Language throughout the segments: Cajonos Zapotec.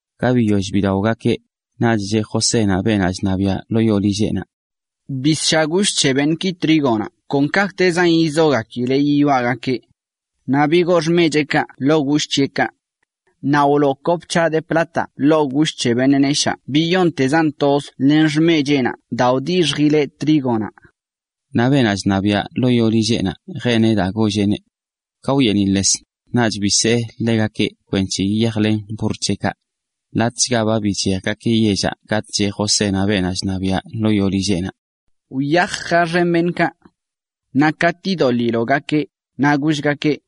Ka biyoll bidaogakeꞌ, naꞌch cheꞌ Josénaꞌ beenaꞌ chṉabiaꞌ ḻoo yoo lilleꞌnaꞌ: ―Bisshaꞌ gush c̱he beṉꞌki trígonaꞌ kon kaꞌkꞌtezan yizogakileꞌ yiyoaꞌgakeꞌ. Naꞌ bigoo xmecheꞌkaꞌ ḻoo gush c̱heꞌkaꞌ. Naꞌ wloo kop c̱haꞌ de plataꞌ ḻoo gush c̱he beṉꞌ neshaa biyoṉtezan toz len xmecheꞌnaꞌ daa wdixjileꞌ trígonaꞌ. Naꞌ beenaꞌ chṉabiaꞌ ḻoo yoo lilleꞌnaꞌ jeneꞌ daa golleꞌneꞌ. Ka wyeeniꞌḻes, naꞌch bisee ḻegakeꞌ kwenc̱he yiyajlen burr c̱heꞌkaꞌ. Latꞌchga ba bichejgakeꞌ yellaꞌ katꞌ cheꞌ Josénaꞌ beenaꞌ chṉabiaꞌ ḻoo yoo lilleꞌnaꞌ: ―Wyaj, jaxen beṉꞌkaꞌ. Naꞌ katꞌ idoḻiloꞌgakeꞌ, naꞌ gollgakeꞌ: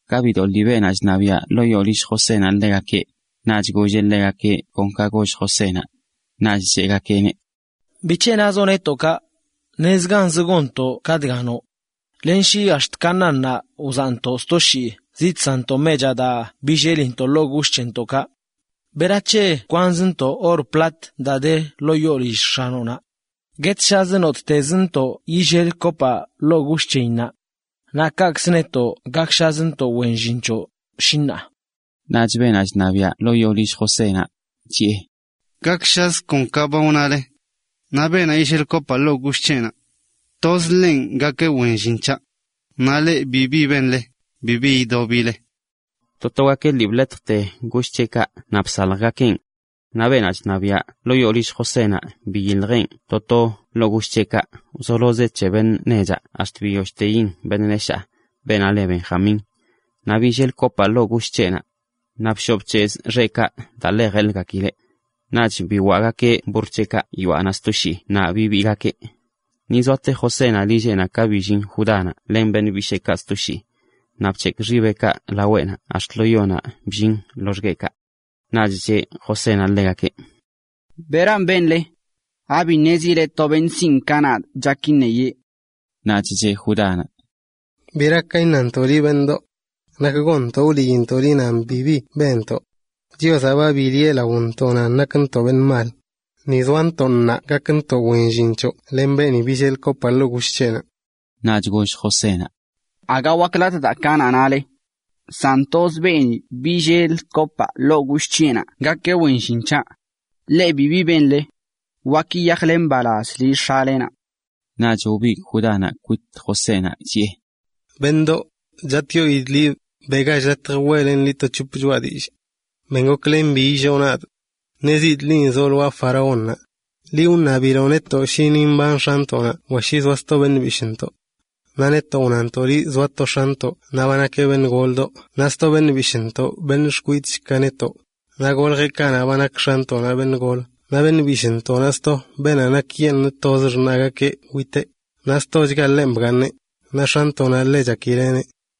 Ka bidoḻi beenaꞌ chṉabiaꞌ ḻoo yoo lill Josénaꞌ ḻegakeꞌ, naꞌch golleꞌ ḻegakeꞌ kon ka goll Josénaꞌ. Naꞌch cheꞌgakeꞌneꞌ: ―¿Bic̱he nazoꞌ netoꞌ kaꞌ? Nezganzə gonntoꞌ ka dga noꞌ. Len shi ax̱t Canaánnaꞌ wzaꞌntoꞌ sto shii zidsanntoꞌ mechaꞌ daa billelintoꞌ ḻoo gush c̱hentoꞌkaꞌ ¿berac̱he kwanzntoꞌ or plat daa de ḻoo yoo lill x̱anoꞌnaꞌ? ¡Guetshazə nottezntoꞌ yillel kopaꞌ ḻoo gush c̱heyinnaꞌ! Naꞌ kaꞌkz netoꞌ gakshazntoꞌ wen llin c̱hoꞌ, shi ṉaa. Naꞌch beenaꞌ chṉabiaꞌ ḻoo yoo lill Josénaꞌ chiꞌe: ―Gakshazə kon ka ba wnale. Naꞌ beenaꞌ yillel kopaꞌ ḻoo gush c̱heꞌnaꞌ, toz ḻenꞌ gakeꞌ wen llin c̱haꞌ. Naꞌ leꞌ bibi benle, bibi idobile. To togakeꞌ lii bḻetjte gush c̱heꞌkaꞌ naꞌ bsaljgakeꞌn. Naꞌ beenaꞌ chṉabiaꞌ ḻoo yoo lill Josénaꞌ biyiljeꞌn to to ḻoo gush c̱heꞌkaꞌ wzolozeꞌ c̱he beṉꞌ nechaꞌ ax̱t biyollteyin beṉꞌ neshaa, beenaꞌ le Benjamín. Naꞌ billel kopaꞌ ḻoo gush c̱heꞌnaꞌ. Naꞌ bshoꞌ bc̱hezꞌ xeꞌkaꞌ daa ḻe jeḻgakileꞌ. Naꞌch biwaꞌgakeꞌ burr c̱heꞌkaꞌ yoaꞌnaꞌ sto shii naꞌ bibiigakeꞌ. Ni zoate Josénaꞌ lilleꞌnaꞌ ka billin Judánaꞌ len beṉꞌ bisheekaꞌ sto shii. Naꞌ bc̱hekꞌ xibeꞌkaꞌ laweꞌnaꞌ ax̱t lo yonaꞌ bllin loxgueꞌkaꞌ. Naꞌch cheꞌ Josénaꞌ ḻegakeꞌ: ―¿Beran benle? ¿Abi ṉezile to beṉꞌ sinꞌ ka nadꞌ chak iṉeyee? Naꞌch cheꞌ Judánaꞌ: ―¿Bera ka iṉantoꞌ liꞌ, beṉꞌdoꞌ? ¿Nak gonntoꞌ wliintoꞌ liꞌ nan bibi benntoꞌ? Chiozaꞌ ba biliꞌe laontoꞌ nan nakntoꞌ beṉꞌ mal. Ni zoantoꞌ ṉaa gakntoꞌ wen llin c̱hoꞌ len beeni billel kopaꞌ ḻoo gush c̱heꞌnaꞌ. Naꞌch goll Josénaꞌ: ―Aga waklatꞌ daa ka(?) nale. San toz beeni billel kopaꞌ ḻoo gush c̱heꞌnanꞌ gakeꞌ wen llin c̱haꞌ. Leꞌ bibi benle. Wak yiyajle mbalaz lill x̱alenaꞌ. Naꞌch wbigꞌ Judánaꞌ kwit Josénaꞌ chiꞌe: ―Beṉꞌdoꞌ, chatꞌyoidꞌ liꞌ, beꞌgach latj weꞌlenꞌ liꞌ to c̱hop choꞌa dillꞌ. Ben goklen bi illoo nadꞌ. Ṉezidꞌ linꞌ zoꞌ lwaa faraónnaꞌ. Liꞌ wṉabiloꞌ netoꞌ shi ni mban x̱antoꞌnaꞌ wa shi zoa sto beṉꞌ bishꞌntoꞌ. Naꞌ netoꞌ wnantoꞌ liꞌ zoa to x̱antoꞌ naꞌ ba nakeꞌ beṉꞌ goldoꞌ naꞌ sto beṉꞌ bishꞌntoꞌ beṉꞌ xkwidꞌch ka netoꞌ, naꞌ goljeꞌ kanaꞌ ba nak x̱antoꞌnaꞌ beṉꞌ golə. Naꞌ beṉꞌ bishꞌntoꞌnaꞌ sto beenaꞌ nakyeṉꞌ toz xṉaꞌgakeꞌ witeꞌ, naꞌ stochga ḻenꞌ bgaaṉeꞌ, naꞌ x̱anntoꞌnaꞌ ḻe chakileꞌneꞌ.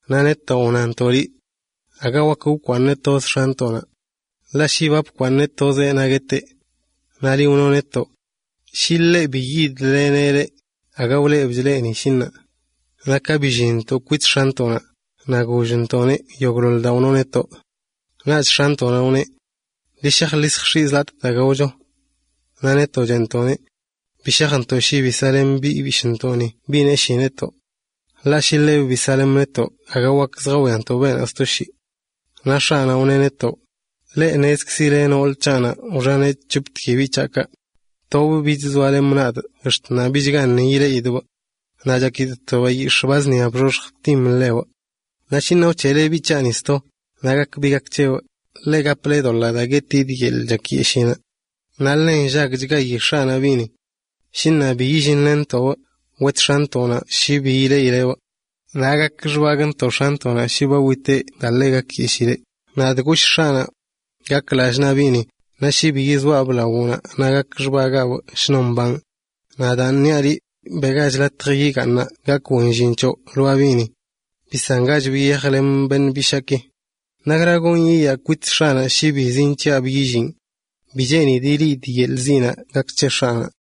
Naꞌ netoꞌ wnantoꞌ liꞌ aga wak wkwaaṉbꞌ toz x̱antoꞌnaꞌ. Ḻaꞌ shi ba bkwaaṉbꞌ tozeꞌ naꞌ gueteꞌ. Naꞌ liꞌ wnoꞌ netoꞌ shi bi yidlenntoꞌbꞌ, aga wlebchoꞌ netoꞌ, shi ṉaa. ’Naꞌ ka billinntoꞌ kwit x̱antoꞌnaꞌ, naꞌ gollntoꞌneꞌ yogꞌḻoḻ daa wnoꞌ netoꞌ. Naꞌch x̱antoꞌnaꞌ wneꞌ: “Ḻi shaj ḻi lljx̱iꞌ zi latꞌ daa gaocho.” Naꞌ netoꞌ cheꞌntoꞌneꞌ: “Bi shajntoꞌ shi bi saꞌlen biꞌ bishꞌntoꞌ biꞌ neshii netoꞌ. Ḻaꞌ shi ḻebꞌ bi saꞌlemꞌ netoꞌ aga wak lljawiantoꞌ beenaꞌ sto shii.” Naꞌ x̱aꞌnaꞌ, wneꞌ netoꞌ: “Leꞌ ṉezikzileꞌ nool c̱haꞌnaꞌ wxaneꞌ c̱hoptki biꞌ c̱haꞌkaꞌ. Tobꞌ bich zoalemꞌ nadꞌ naꞌ ax̱t ṉaa bichgaṉꞌ ileꞌidꞌbꞌ. Naꞌ chakidꞌ to bayix̱ꞌ ba zṉia bxoxj btim ḻebꞌ. Naꞌ shi ṉaa wc̱heꞌle biꞌ c̱haꞌni sto, naꞌ gak bi gak c̱hebꞌ, leꞌ gaple doḻꞌ daa guetidꞌ yeḻꞌ chakyeshiinaꞌ.” ’Naꞌ ḻe nllagchgayi x̱aꞌnaꞌ biꞌni. Shi ṉaa bi yillinlenntoꞌbꞌ, wet x̱antoꞌnaꞌ shi bi ileꞌileꞌbꞌ. Naꞌ gak xbagꞌntoꞌ x̱antoꞌnaꞌ shi ba witeꞌ daa ḻe gakyeshiileꞌ. Nadꞌ goshꞌ x̱aꞌnaꞌ: “Gak lallꞌ naa biꞌni, naꞌ shi bi yizoaꞌbꞌ lawoꞌnaꞌ naꞌ gak xbagaabꞌ shnon mbanꞌ.” Naꞌ daan niaꞌ liꞌ, beꞌgach latj yigaaṉaꞌ gakꞌ wen llin c̱hoꞌ lwaa biꞌni. Bisangachbꞌ yiyajlemꞌ beṉꞌ bishaaki. ¿Nakra gonꞌ yiyaa kwit x̱aꞌnaꞌ shi bi zinc̱hiꞌabꞌ yillinꞌ? Bi cheenidꞌ ileꞌidꞌ yeḻꞌ ziꞌnaꞌ gak c̱he x̱aꞌnaꞌ.